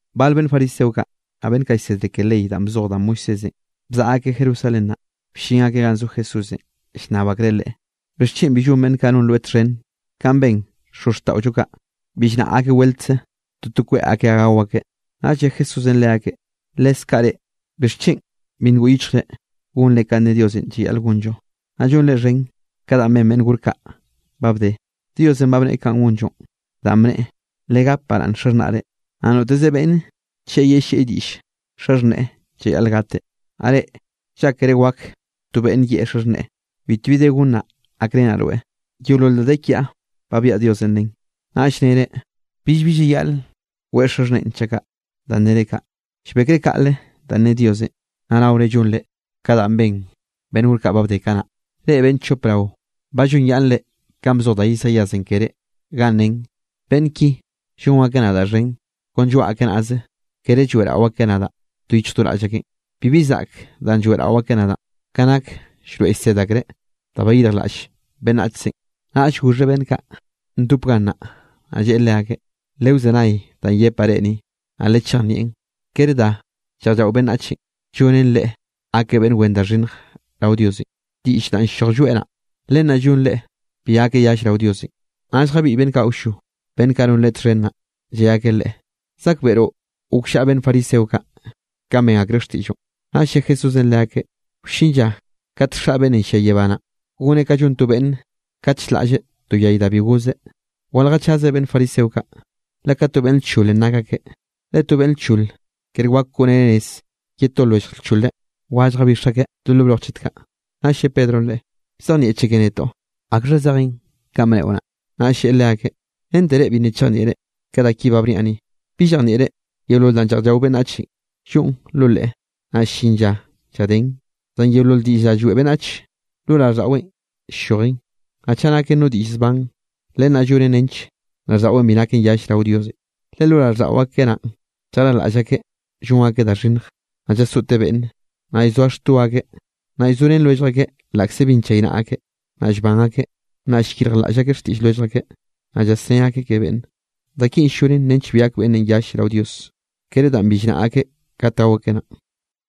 Bal beꞌnn fariseo kaꞌ, naꞌ beꞌnn kaꞌ llsedre ke ley danꞌ bzoj da Moisésenꞌ bzaꞌa akeꞌ Jerusalén naꞌ, bllin akeꞌ ganꞌ zo Jesúsenꞌ, llnnab akreꞌ Leꞌe: —¿Bixchen bi llon beꞌnn kaꞌ non rweꞌ txhen kanꞌ ben xozxtaꞌollo kaꞌ, bi llnaꞌa akeꞌ weltze toto kweꞌ akeꞌ gao akeꞌ? Naꞌll lle Jesúsenꞌ leakeꞌ: —Leskaꞌ reꞌ, ¿bixchen bi ngoꞌ yichjre gonre kanꞌ ne Diosenꞌ llayaꞌl gonllo, naꞌ llonre xhen ka danꞌ ben beꞌnn gor kaꞌ ba bde? Diosenꞌ ba bneꞌe kanꞌ gonllonꞌ, danꞌ bneꞌe: “Legap baraꞌnn xaxhnaꞌre”, naꞌ “Noteze beꞌnne chaꞌ yellieꞌ diꞌll xaxhneꞌe llayaꞌl gateꞌ.” Naꞌ reꞌ llákere wak to beꞌnn yeꞌe xaxhneꞌe: “Bitbi de gonnaꞌ gakrenaꞌ rweꞌ, yeolol da de kiaꞌ ba biaꞌa Diosenꞌ len.” Naꞌll nere billbi llayaꞌl weꞌe xaxhneꞌen chaꞌ kaꞌ. Danꞌ nere kaꞌ, llbekre kaꞌle danꞌ ne Diosenꞌ, naꞌ naore llonre ka danꞌ ben beꞌnn gor kaꞌ ba bde kanaꞌ. Reꞌ beꞌnn chop rao ba llonyaꞌnnre kanꞌ bzoj da Isaíasenꞌ keré, ganꞌ nen: Beꞌnn ki llon akeꞌ nadaꞌ xhen kon lloaꞌ akeꞌ nazeꞌ, kere lloeꞌrao akeꞌ nadaꞌ do yichj do raꞌll akeꞌn. Bibi zaꞌk danꞌ lloeꞌrao akeꞌ nadaꞌn, ka nak llroeꞌ llsed akreꞌ da bayirjlaꞌll beꞌnnachzenꞌ. Naꞌll goxheꞌ beꞌnn kaꞌ ndop gannaꞌ, naꞌ lleꞌe leakeꞌ: —Lewzenay danꞌ yepaꞌ reꞌ ni, naꞌ lechejnieꞌn. Kere da lleꞌj llao beꞌnnachenꞌ llonen leꞌe gakeꞌ beꞌnn wen da xhinnj rao Diosenꞌ. Diꞌll danꞌ ll-lloj lloeꞌ naꞌ, len naꞌ llon leꞌe bi gakeꞌ yall rao Diosenꞌ. Naꞌll jabiꞌy beꞌnn kaꞌ awllo, beꞌnn kaꞌ non Leꞌe txhen naꞌ, lle akeꞌ Leꞌe: —¿Zakbeꞌroꞌ gokllaꞌa beꞌnn fariseo kaꞌ, kanꞌ ben akreꞌ xtiꞌlloꞌn? Naꞌll lle Jesúsenꞌ leakeꞌ: —Wllin lla kate Xaꞌ beꞌnnenꞌ llia yebá naꞌ, goneꞌ ka llon to beꞌnn kat ll-laꞌlleꞌ no yay da bi gozeꞌ. Waljechaze beꞌnn fariseo kaꞌ, le ka to beꞌnn lcholenꞌ nak akeꞌ, le to beꞌnn lchol kere wak koꞌreneꞌ nez ye to lwellj lchole, wa lljabix akeꞌ do lo broj chet kaꞌ. Naꞌll lle Pedronꞌ Leꞌe: —Bzejnieꞌcheke netoꞌ akxha zejen kanꞌ bneꞌo naꞌ. Naꞌll lleꞌe leakeꞌ: —¿Rente reꞌ bi nna chejnieꞌre ka da ki ba bniaꞌ ni? ¿Bi llejnieꞌre yeolol danꞌ lleꞌj llao beꞌnnache lloꞌn lo leꞌe, naꞌ ll-llin lla lladen? Zan yeolol diꞌll da lloeꞌ beꞌnnach, lo raꞌlldaꞌweꞌn ll-llojen. Naꞌ chaꞌ naken no diꞌll zban, len naꞌ llonen nench raꞌlldaꞌweꞌn bi naken yall rao Diosenꞌ. Le lo raꞌlldaꞌo akeꞌ naꞌn llarjlaꞌll akeꞌ llon akeꞌ da xhinnj, naꞌ llasoꞌte beꞌnne, naꞌ llzoa xto akeꞌ, naꞌ llzorén lwellj akeꞌ laꞌkze bi nchaynaꞌa akeꞌ, naꞌ llban akeꞌ, naꞌ llyirjlaꞌll akeꞌ xtiꞌll lwellj akeꞌ, naꞌ llasnné akeꞌ ke beꞌnne. Da kinꞌ ll-llonen nench bi gak beꞌnne yall rao Dios, kere danꞌ bi llnaꞌa akeꞌ kat gao akeꞌ naꞌn.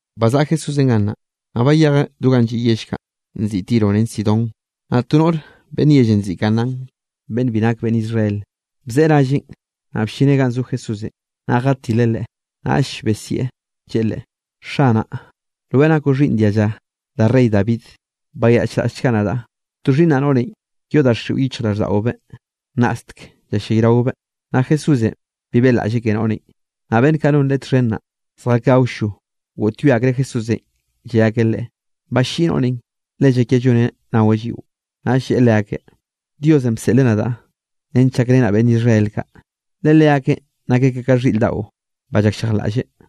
Bazaꞌa Jesúsenꞌ gannaꞌ, naꞌ bayejeꞌ do ganꞌ lliꞌ yell kaꞌ nziꞌi Tiro ren Sidón. Naꞌ to noꞌr beꞌnn yellenꞌ nziꞌi Canaán beꞌnn bi nake beꞌnn Israel, bzeꞌe ralleꞌn, naꞌ bllineꞌ ganꞌ zo Jesúsenꞌ, naꞌ jatileꞌ Leꞌe, naꞌll besieꞌ lleꞌe Leꞌe: —¡Xanaꞌ, rweꞌ nakoꞌ xhiꞌnn dialla da rey David, bayaꞌchraꞌllchga nadaꞌ! To xhiꞌnnaꞌ noꞌrenꞌ yoꞌ daxiꞌo yichjraꞌlldaꞌobeꞌ, nnaꞌstek ll-llayraobeꞌ. Naꞌ Jesúsenꞌ bi beꞌlaꞌlleꞌ ke noꞌrenꞌ. Naꞌ beꞌnn kaꞌ non Leꞌe txhen naꞌ, zjakeꞌ awllo, goꞌtyoe akreꞌ Jesúsenꞌ lle akeꞌ Leꞌe: —Balliꞌi noꞌrenꞌ, le llakia lloneꞌ naweꞌ lliꞌo. Naꞌll lleꞌe leakeꞌ: —Diosenꞌ bseꞌleꞌ nadaꞌ nench llakrenaꞌ beꞌnn Israel kaꞌ, le leakeꞌn nak akeꞌ ka xhiꞌr daꞌo ba llakllejlaꞌlle.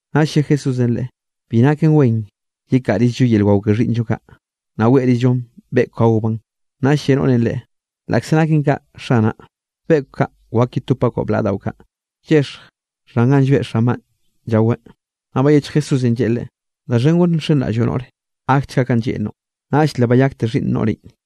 Naꞌll lle Jesúsenꞌ leꞌe: —Bi naken wen yekaꞌrizllo yel wao ke xhiꞌnnllo kaꞌ, naꞌ weꞌrizllo beꞌkw gaobaꞌn. Naꞌll lle noꞌrenꞌ Leꞌe: —Laꞌkze naken kaꞌ, Xanaꞌ, beꞌkw kaꞌ wak yetopbaꞌ blaꞌa daꞌo kaꞌ, llexj xhan ganꞌ llbeꞌ xanbaꞌ llaweꞌ. Naꞌll bayechj Jesúsenꞌ lleꞌe leꞌe: —¡Da xhen gore nxenraꞌlloꞌ, noꞌre! Gakchga kanꞌ lleꞌnroꞌn. Naꞌll le bayakte xhiꞌnn noꞌrenꞌ.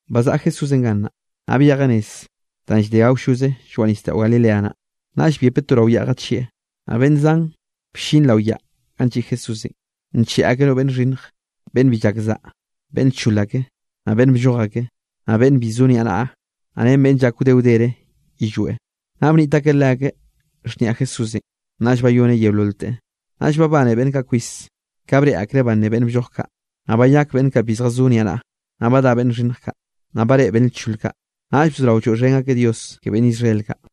Bazaꞌa Jesúsenꞌ gannaꞌ, naꞌ byejeꞌ nez danꞌ llde awlloze lloaꞌ nisdaꞌo Galilea naꞌ, naꞌll byepeꞌ to rao yaꞌ jachieꞌ. Naꞌ beꞌnn zan bllin rao yaꞌn ganꞌ lliꞌ Jesúsenꞌ, ncheꞌe akeꞌ no beꞌnn nxhinnje, beꞌnn bi llak saꞌa, beꞌnn lchole ake, naꞌ beꞌnn blloj ake, naꞌ beꞌnn bi zo niaꞌnaꞌa, naꞌ ren beꞌnn llak wde wdere yillweꞌ, naꞌ bniꞌt akeꞌ leakeꞌ xhniaꞌ Jesúsenꞌ, naꞌll bayoneꞌ yeololteꞌ. Naꞌll babane beꞌnn kaꞌ kwis ka breꞌe akreꞌ banné beꞌnn blloj kaꞌ, naꞌ bayak beꞌnn kaꞌ bi zjazó niaꞌnaꞌa, naꞌ badá beꞌnn xhinnj kaꞌ, naꞌ bareꞌe beꞌnn lchol kaꞌ. Naꞌll bzorao lloeꞌxhen akeꞌ Dios ke beꞌnn Israel kaꞌ.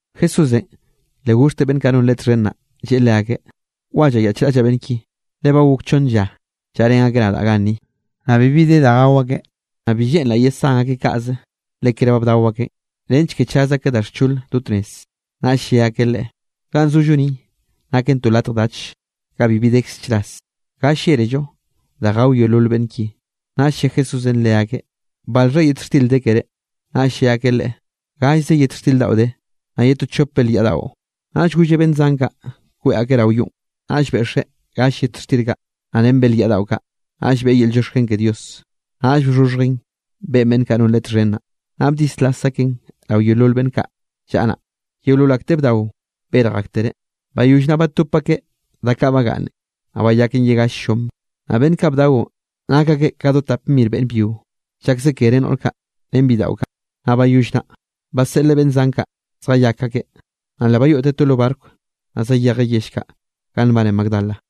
Jesúsenꞌ le goxhteꞌ beꞌnn kaꞌ non Leꞌe txhen naꞌ, lleꞌe leakeꞌ: —Wa llayaꞌchraꞌllaꞌ beꞌnn ki, le ba gok chonn lla llaꞌrén akeꞌ nadaꞌ ganni, naꞌ bibi de da gao akeꞌ. Naꞌ bi lleꞌnraꞌ yesán akeꞌ kaꞌze, le kere ba bdao akeꞌn, nench ke chaz akeꞌ da xchol do tnez. Naꞌll lle akeꞌ Leꞌe: —Ganꞌ zollo ni naken to latj dach, ga bibi dekze chras. ¿Ga llélello da gao yeolol beꞌnn ki? Naꞌll lle Jesúsenꞌ leakeꞌ: —¿Balxha yet xtir de keré? Naꞌll lle akeꞌ Leꞌe: —Gallze yet xtir daꞌo de, naꞌ ye to chop belyaꞌ daꞌo. Naꞌll golleꞌ beꞌnn zan kaꞌ kweꞌ akeꞌ rao yonꞌ. Naꞌll beꞌxeꞌ gall yet xtir kaꞌ, naꞌ ren belyaꞌ daꞌo kaꞌ, naꞌll beꞌe yel llioxken ke Dios, naꞌll bxhoxhjeꞌn beꞌe beꞌnn kaꞌ non Leꞌe txhen naꞌ, naꞌ bdislas akeꞌn rao yeolol beꞌnn kaꞌ llaꞌa naꞌ. Yeolol akteꞌ bdao berj aktereꞌ. Bayoll naꞌ batop akeꞌ da kaꞌ bagaꞌnne, naꞌ bayaken ye gall llom. Naꞌ beꞌnn kaꞌ bdaonꞌ nak akeꞌ ka do tap mir beꞌnn byio, llakze kere noꞌr kaꞌ ren bidaꞌo kaꞌ. Naꞌ bayoll naꞌ, baseꞌleꞌ beꞌnn zan kaꞌ zjayak akeꞌ, naꞌ le bayoꞌteꞌ to lo barco, naꞌ zayejeꞌ yell kaꞌ ganꞌ nbane Magdala.